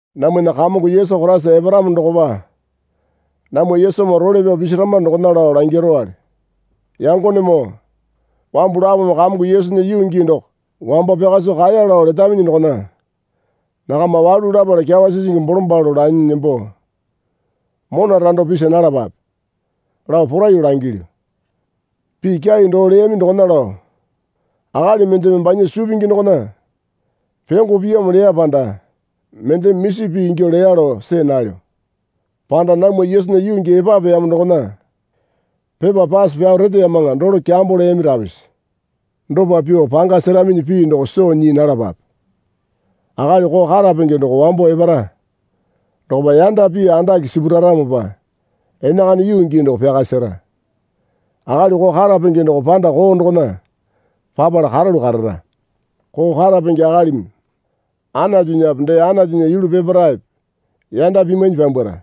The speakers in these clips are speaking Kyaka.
Namwana Kamongo Yesu Koraisa eparamo dokopa namwa Yesumoo role pyao pisirama dokona lao langirowale. Yangonemoo wambu lapome Kamongo Yesunya yuu gii doko wambo pyaka soo kaeya lao letaminyi dokona nakama walu lapala kyawa sisingi bolombalo lanyi nembo mona rando pisa nalapape, lao poraiyuo langilyu. Pii kyai doo leyami dokona lao akali mendeme banya suu pingi dokona pyongo piyamo leya panda mendeme misi pii ingyuo leya lao see nalyo. Panda namwa Yesunya yuu gii epapeyamo dokona pepa pase pyao reteyamaŋa dolo kyambo leyami rapisa. Dopa pyuo panga seraminyi pii doko soo nyii nalapape. Akali koo karapenge doko wambo epara dokopa yanda pii andake sipuraramopa enakana yuu gii doko pyaka sera. Akali koo karapenge doko panda koo dokona papala karalu karara. Koo karapenge akalimi Anatunyape dee Anatunya yulu peparaepe yanda pimwainyi pyambwara.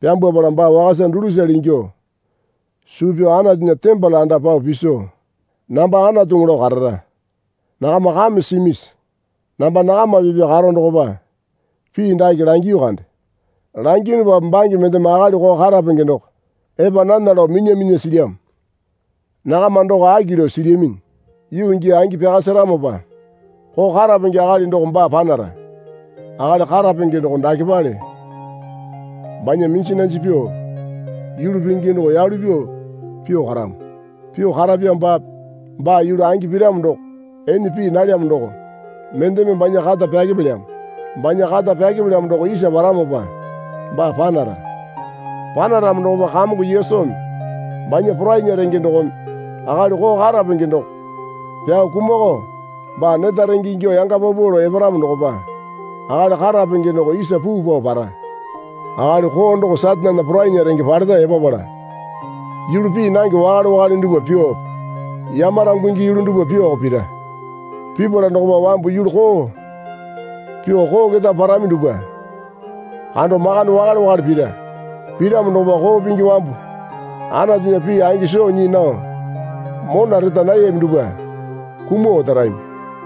Pyambwapala baa wakasa dulusale ingyuo suu pyao Anatunya tembole anda pao piso namba anatuŋu lao karara. Nakama kame simisi? Namba nakama pipya karo dokopa pii dake langiyu kande. Langiyunupape bange mendeme akali koo karapenge doko epa nana lao minya minya silyamo. Nakama doko aki lao silyaminyi. Yuu gii angi pyaka seramopa koo karapenge akali doko baa panara. Akali karapenge doko dakepale banya minji nanji pyuo yulu pingi doko yalu pyuo pyuo karamo. Pyuo karapyamopape baa yulu angi piramo doko ene pii nalyamo doko mendeme banya kata pyakepelyamo. Banya kata pyakepelyamo doko isa paramopa baa panara. Panaramo dokopa Kamongo Yesumi banya porainya renge dokome akali koo karapenge doko pyao kumakao baa neta renge ingyuo yanga paupau lao eparamo dokopa akali karapenge doko isa puu pao para. Akali koo doko Satanena porainya renge paleta epapala yulu pii nange wakale wakale dupwa pyuope yamarangungi yulu dupwa pyuoko pira. Pipala dokopa wambu yulu koo pyuo koo keta parami dupwa kando makande wakale wakale pira. Piramo dokopa koo pingi wambu Anatunya pii angi soo nyii nao mona reta nayami dupwa kumuo otarami.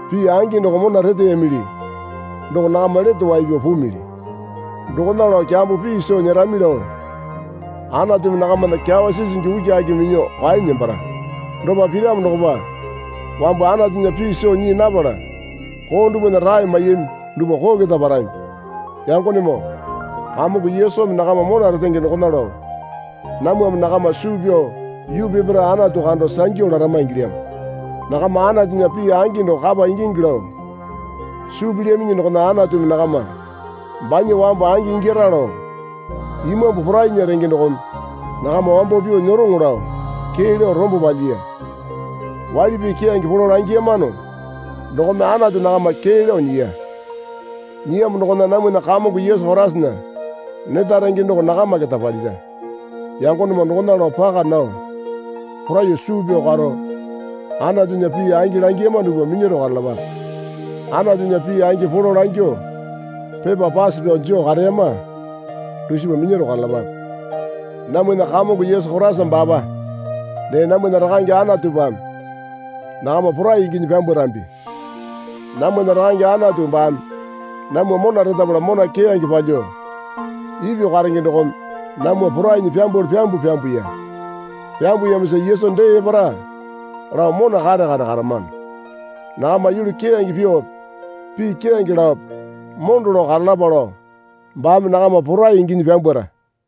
Pii angi doko mona reteyamili doko nakama lete wai pyao pumili. Dokona lao kyambo pii soo nyerami lao Anatumi nakamana kyawa sisingi ukiaki minyuo kwaenyi nembara. Dopa piramo dokopa wambu Anatunya pii soo nyii napala koo dupwana rae maiyami dupwa koo keta parami. Yangonemoo Kamongo Yesumi nakama mona retenge dokona lao namwame nakama suu pyao yuu peparae Anatu kando sangyu larama ingilyamo. Nakama Anatunya pii angi doko kapa ingingi lao suu pilyaminyi dokona Anatumi nakama banya wambu angi ingyara lao Imambu porainya renge dokome nakama wambo pyuo nyeroŋa lao kee lao rombo palyiya. Waili pii keyange polo langiyamano dokome Anatu nakama kee lao nyiya. Nyiyamo dokona namwana Kamongo Yesu Koraisana neta renge doko nakama keta palira. Yangonemoo dokona lao paka nao poraiyuo suu pyao karo Anatunya pii angi langiyama dupwa minyaro karalapape. Anatunya pii angi polo langyuo pepa pase pyao joo kareyama dusipa minyaro karalapape. Namwana Kamongo Yesu Koraisa baapa dee namwana Rakange Anatupame nakama porai inginyi pyambwarambi. Namwana Rakange Anatu baame namwa mona retapala mona keyange palyuo ipyuo karenge dokome namwa porainyi pyambwalu pyambuo pyambuya. Pyambuyamosa Yesu dee epara lao mona kare kare karamano. Nakama yulu keyange pyuope pii keyange laope mondo lao karalapa lao baame nakama porai inginyi pyambwara.